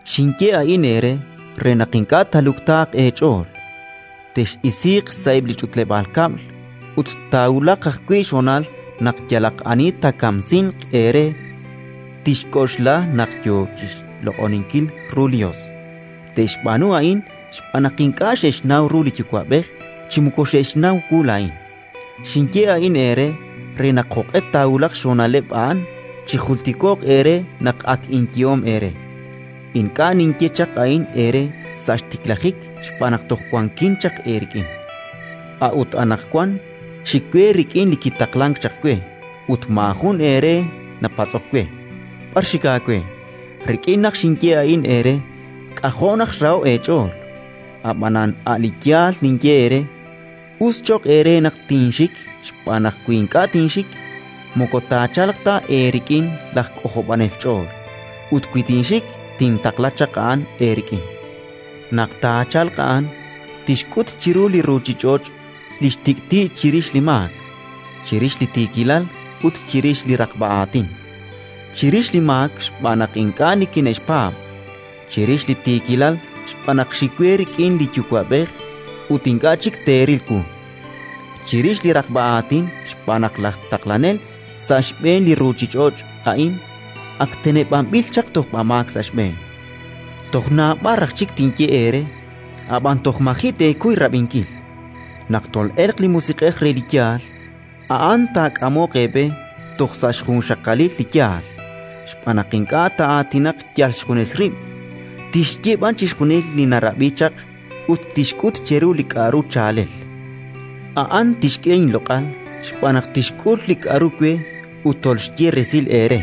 “Xinye a'in eere re naq ink'a' taaluktaaq eech'ool. Tex'isiiq sa'eb' li ch'utleb'aal kab'l. Ut taawulaq ajwi' xhonal naq yalaq ani taakamsinq eere tixk'oxla naq yo chi xloq'oninkil ru li Yos. Te'xb'aanu a'in xb'aan naq ink'a' xe'xnaw ru li Yuwa'b'ej chi moko xe'xnaw wu laa'in. Xinye a'in eere, re naq, jo'q'e taawulaq xhonaleb' a'an, chijultiko'q eere naq ak inyehom eere. Li xk'anjel li Santil Musiq'ej “Ink'a' xinye chaq a'in eere sa' xtiklajik xb'aan naq toj wankin chaq eerik'in. A'ut anaqwan xik we rik'in li kitaqlank chaq we ut maajun eere napatz'ok we: «B'ar xik aawe?». Rik'in naq xinye a'in eere, k'ajo' naq xraho'k eech'ool. Ab'anan a' li yaal ninye eere: us cho'q eere naq tinxik, xb'aan naq wi ink'a' tinxik, moko taachalq ta eerik'in laj K'ojob'anel ch'ool; ut wi tinxik, tintaqla chaq a'an eerik'in. “Naq taachalq a'an, tixk'ut chiru li ruuchich'och' li xtik'ti' chirix li maak, chirix li tiikilal ut chirix li raqb'a aatin: chirix li maak xb'aan naq ink'a' nikine'xpaab'; chirix li tiikilal xb'aan naq xik we rik'in li Yuwa'b'ej ut ink'a' chik teeril wu; chirix li raqb'a aatin xb'aan naq laj Taqlanel sa' xb'een li ruuchich'och' a'in ak teneb'anb'il chaq tojb'amaak sa' xb'een. “Toj naab'al raj chik tinye eere, ab'an toj maji' teekuy rab'inkil. Naq tol'elq li Musiq'ej re li yaal, a'an taak'amoq eeb'e toj sa' xjunxaqalil li yaal, xb'aan naq ink'a' taa'aatinaq yal xjunes rib', tixye b'an chixjunil li narab'i chaq ut tixk'ut cheru li k'aru chaalel. A'an tixk'e inloq'al xb'aan naq tixk'ul li k'aru we ut tolxye resil eere.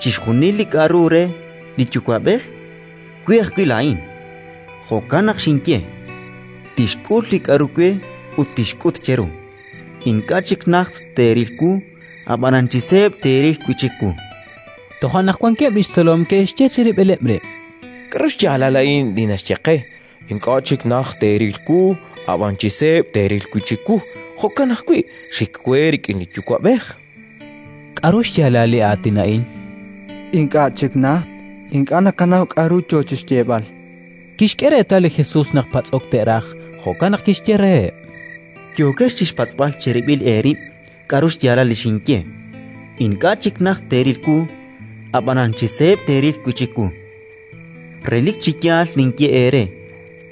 Chixjunil li k'aru re li Yuwa'b'ej, we ajwi' laa'in. Jo'kan naq xinye: «Tixk'ul li k'aru we ut tixk'ut cheru». “Ink'a' chik najt teeril wu, ab'anan chi seeb' teeril wi' chik wu”. Toja' naq wankeb' li xtzolom ke'xye chirib'ileb' rib': —K'aru xyaalal a'in li naxye qe: «Ink'a' chik najt teeril wu, ab'anan chi seeb' teeril wi' chik wu»; jo'kan ajwi': «Xik we rik'in li Yuwa'b'ej»? K'aru xyaalal li aatin a'in: «Ink'a' chik najt»? Ink'a' naqanaw k'aru yo chi xyeeb'al. Kixk'e reetal li Jesus naq patz'ok te'raj, jo'kan naq kixye reheb': —Yookex chi xpatz'b'al cherib'il eerib' k'aru xyaalal li xinye: «Ink'a' chik najt teeril wu, ab'anan chi seeb' teeril wi' chik wu»? Relik chi yaal ninye eere: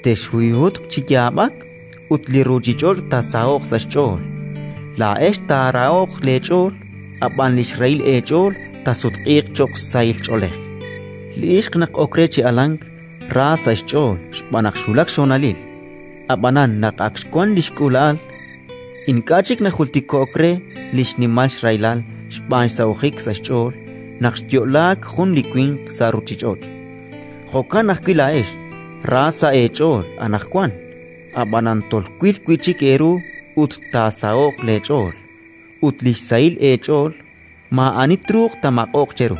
texhuyhutq chi yaab'ak ut li ruuchich'och' taasaho'q sa' xch'ool. Laa'ex taarahoq leech'ool, ab'an li xrahil eech'ool taasutq'iiq cho'q sahil ch'oolej. Li ixq naq ok re chi alank, ra sa' xch'ool xb'aan naq xwulak xhonalil; ab'anan naq ak xwank li xk'uula'al, ink'a' chik najultiko'k re li xnimal xrahilal xb'aan xsahojik sa' xch'ool naq xyo'laak jun li winq sa' ruuchich'och'. Jo'kan ajwi' laa'ex ra sa' eech'ool anaqwan, ab'anan tolwil wi' chik eeru ut taasaho'q leech'ool, ut li xsahil eech'ool maa'ani truuq taamaq'oq cheru.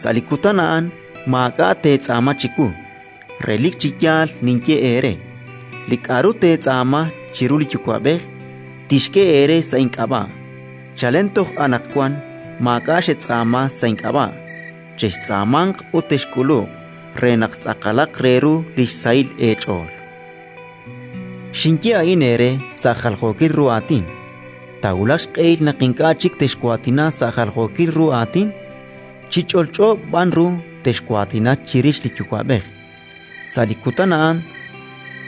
“Sa' li kutan a'an maak'a' teetz'aama chiwu. Relik chi yaal ninye eere: li k'aru teetz'aama chiru li Yuwa'b'ej, tixk'e eere sa' ink'ab'a'. Chalen toj anaqwan maak'a' xetz'aama sa' ink'ab'a'. Chextz'aamanq ut texk'uluq, re naq tz'aqalaq re ru li xsahil eech'ool. “Xinye a'in eere sa' jaljookil ru aatin. Taawulaq xq'ehil naq ink'a' chik texwaatina sa' jaljookil ru aatin, chi ch'olch'o b'an ru texwaatina chirix li Yuwa'b'ej. Sa' li kutan a'an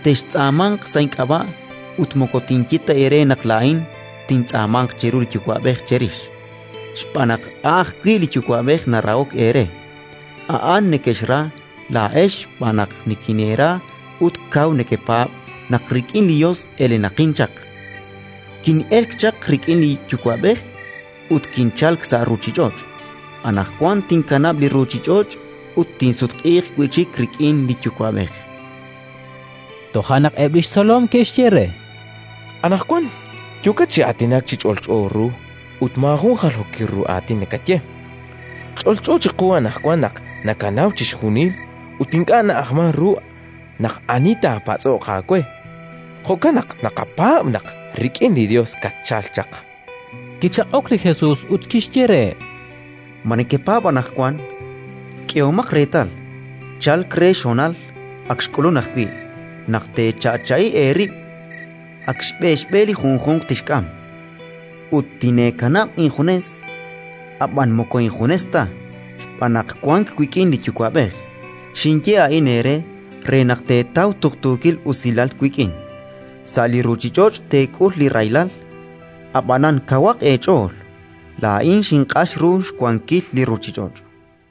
textz'aamanq sa' ink'ab'a', ut moko tinye ta eere naq laa'in tintz'aamanq chiru li Yuwa'b'ej cherix, xb'aan naq a' ajwi' li Yuwa'b'ej narahok eere. A'an nekexra laa'ex xb'aan naq nikineera ut kaw nekepaab' naq rik'in li Yos elenaqin chaq. Kin'elk chaq rik'in li Yuwa'b'ej ut kinchalk sa' ruuchich'och'; anaqwan tinkanab' li ruuchich'och' ut tinsutq'iiq wi' chik rik'in li Yuwa'b'ej”. Toja' naq eb' li xtzolom ke'xye re: —Anaqwan yookat chi aatinak chi ch'olch'o ru ut maajun jaljookil ru aatin nakaye. Ch'olch'o chiqu anaqwan naq nakanaw chixjunil, ut ink'a' na'ajmank ru naq ani taapatz'oq aawe. Jo'kan naq naqapaab' naq rik'in li Yos katchalk chaq. Kichaq'ok li Jesus ut kixye reheb': —Ma nekepaab' anaqwan? K'ehomaq reetal, chalk re xhonal (ak xk'ulunk ajwi') naq teecha'cha'i eerib', ak xb'e xb'e li junjunq tixk'am, ut tineekanab' injunes. Ab'an moko injunes ta, xb'aan naq wank wik'in li Yuwa'b'ej. Xinye a'in eere re naq teetaw tuqtuukil usilal wik'in. Sa' li ruuchich'och' teek'ul li rahilal, ab'anan kawaq eech'ool! Laa'in xinq'ax ru xwankil li ruuchich'och'.